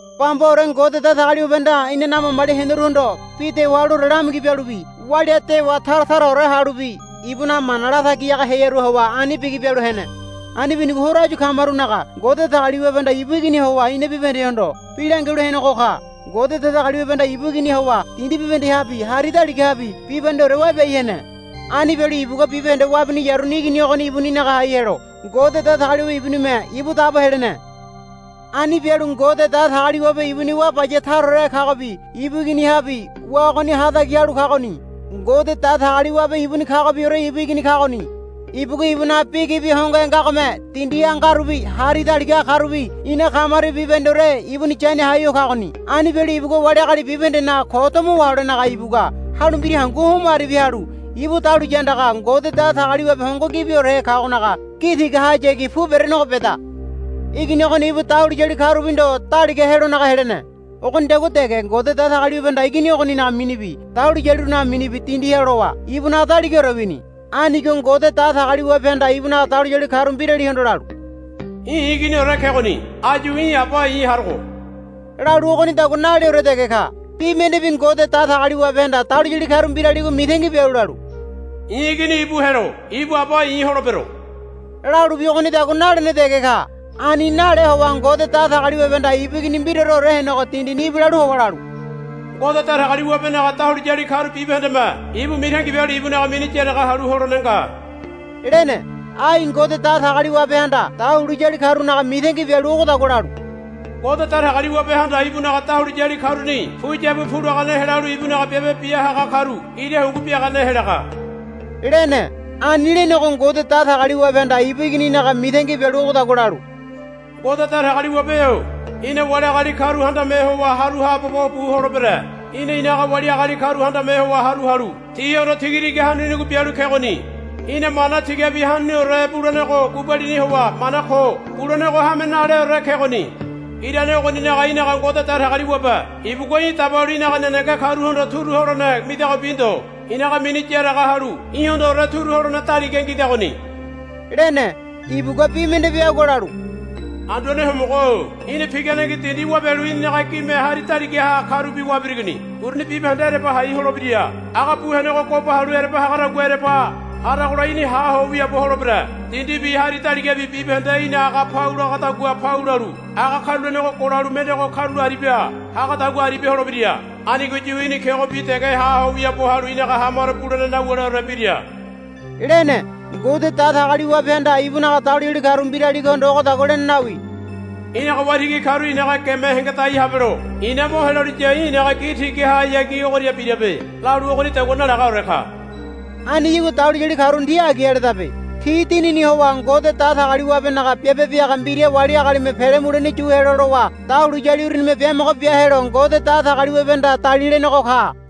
Bambaore Ngode Datagaliwabehanda inanaga mamali heneruhondo bi dewa haluore lamigi bialubi walia dewa tara taraore halubi ibunaga mana latagi haga hearuha howa ani bigi bialu hene. Ani binigo horo áyu kamarunaga Ngode Datagaliwabehanda ibu Iginiha howa ina bibahendehondo bi langialu henego ka. Ngode Datagaliwabehanda ibu Iginiha howa dindi bibahendehabi hari daligahabi bibahendeore wabiai hene. Ani bialu ibugua bibahende wabiniyaruni Igini ogoni ibuninaga hai helo Ngode Datagaliwabe ibunime ibu dabo helene. Ani bialu Ngode Datagaliwabe ibuni wá baya taraorehe kagobi ibu Iginihabi wá ogoni hatagi halu kagoni. Ngode Datagaliwabe ibuni kagobiore ibu Igini kagoni. Ibugua ibunaga bi gibi hongohe ngagome dindiha ngarubi hari daligaha karubi ina kamarubi bibahendeore ibuni yania hai ho kagoni. Ani bialu ibugua wali agali bibahendenaga ko domo waholenaga ibugua halu mbira hangu homo aribia halu ibu dahuliya andaga Ngode Datagaliwabe hongo gibiorehe kagonaga gi tigahayagi pu berenego beda. Igini ogoni ibu dahuliyali karubi ndo daliga helonaga helene. Ogonidagua dege Ngode Datagaliwabehanda Igini ogoninaga minibi dahuliyalirunaga mini dindiha lowa ibunaga daligaore wini. Anigo Ngode Datagaliwabehanda ibunaga dahuliyali karu mbiralihondo lalu, Í̠ i̱ Iginiore kegoni áyu í̠ aba i̱ harogo, lalu ogonidagua naleore dege ka. Bi mendebi Ngode Datagaliwabehanda dahuliyali karu mbiraligo mitangi bialu lalu, I̱ Igini ibu helo ibu aba i̱ holebero, lalubi ogonidagua nalene dege ka. Ani nale howa Ngode Datagaliwabehanda ibu Igini mbiraoreore henego dindini ibilalu howa lalu, Ngode Datagaliwabenaga dahuliyali karu bibahendeme ibu mitangi bialu ibunaga mini yaraga halu holene nga, lene. Ai Ngode Datagaliwabehanda dahuliyali karunaga mitangi bialu ogodagua lalu, Ngode Datagaliwabehanda ibunaga dahuliyali karuni puyabu pulagane helalu ibunaga biabe bia haga karu ira hungu biagane helaga, lene. Ani lenego Ngode Datagaliwabehanda ibu Igininaga mitangi bialu ogodagua lalu, Ngode Datagaliwabe-o í̠na wali agali karu handame howa haru haabobo bu holebere. Í̠na í̠naga wali agali karu handame howa haru halu tihondo tigatiga hanunigo bialu kegoni. Í̠na mana tigabi hanuniore bulenego gubalini howa mana ko bulenego hame naleore kegoni. Irane ogoninaga í̠naga Ngode Datagaliwabe ibugua í̠ dabalu í̠naga nenege karuhondo turu holene midagobi ndo í̠naga mini yaraga halu í̠hondoore turu holene daliga ngidagoni, lene. Ibugua bi mendebi agua lalu, Anduane Homogo-o í̠na piganengi dindi wabialu í̠ninaga gime hari daligaha karubi wabirigoni. Uruni bibahende ereba hai holebira. Aga bu henego goba halu ereba hagadagua ereba haragola í̠ni ha ho wiaabo holebere. Dindibi hari daligabi bibahende í̠na aga pau lagadagua pau lalu aga karulenego golalu mendego karula aribia hagadagua aribia holebira. Anigoyu í̠ni kegobi dege ha ho wiaabo halu í̠naga hamaro bulene nawuleore bira, lene. Ngode Datagaliwabehanda ibunaga dahuliyali karu mbiraligohondo ogodagua lene nawi, Í̠naga waitigi karu í̠naga geme hengedai habelo i̱na mo heloliya í̠ i̱naga gi tigahayagi ogoria birabe, lalu ogonidagua nalagaore ka. Aniyagua dahuliyali karuni ti agi aledabe. Ti dinini howa Ngode Datagaliwabenaga biabe biaga mbira wali agalime pele mulene yu helo lowa dahuliyali urunime biamogo bia helo Ngode Datagaliwabehanda dalilenego ka.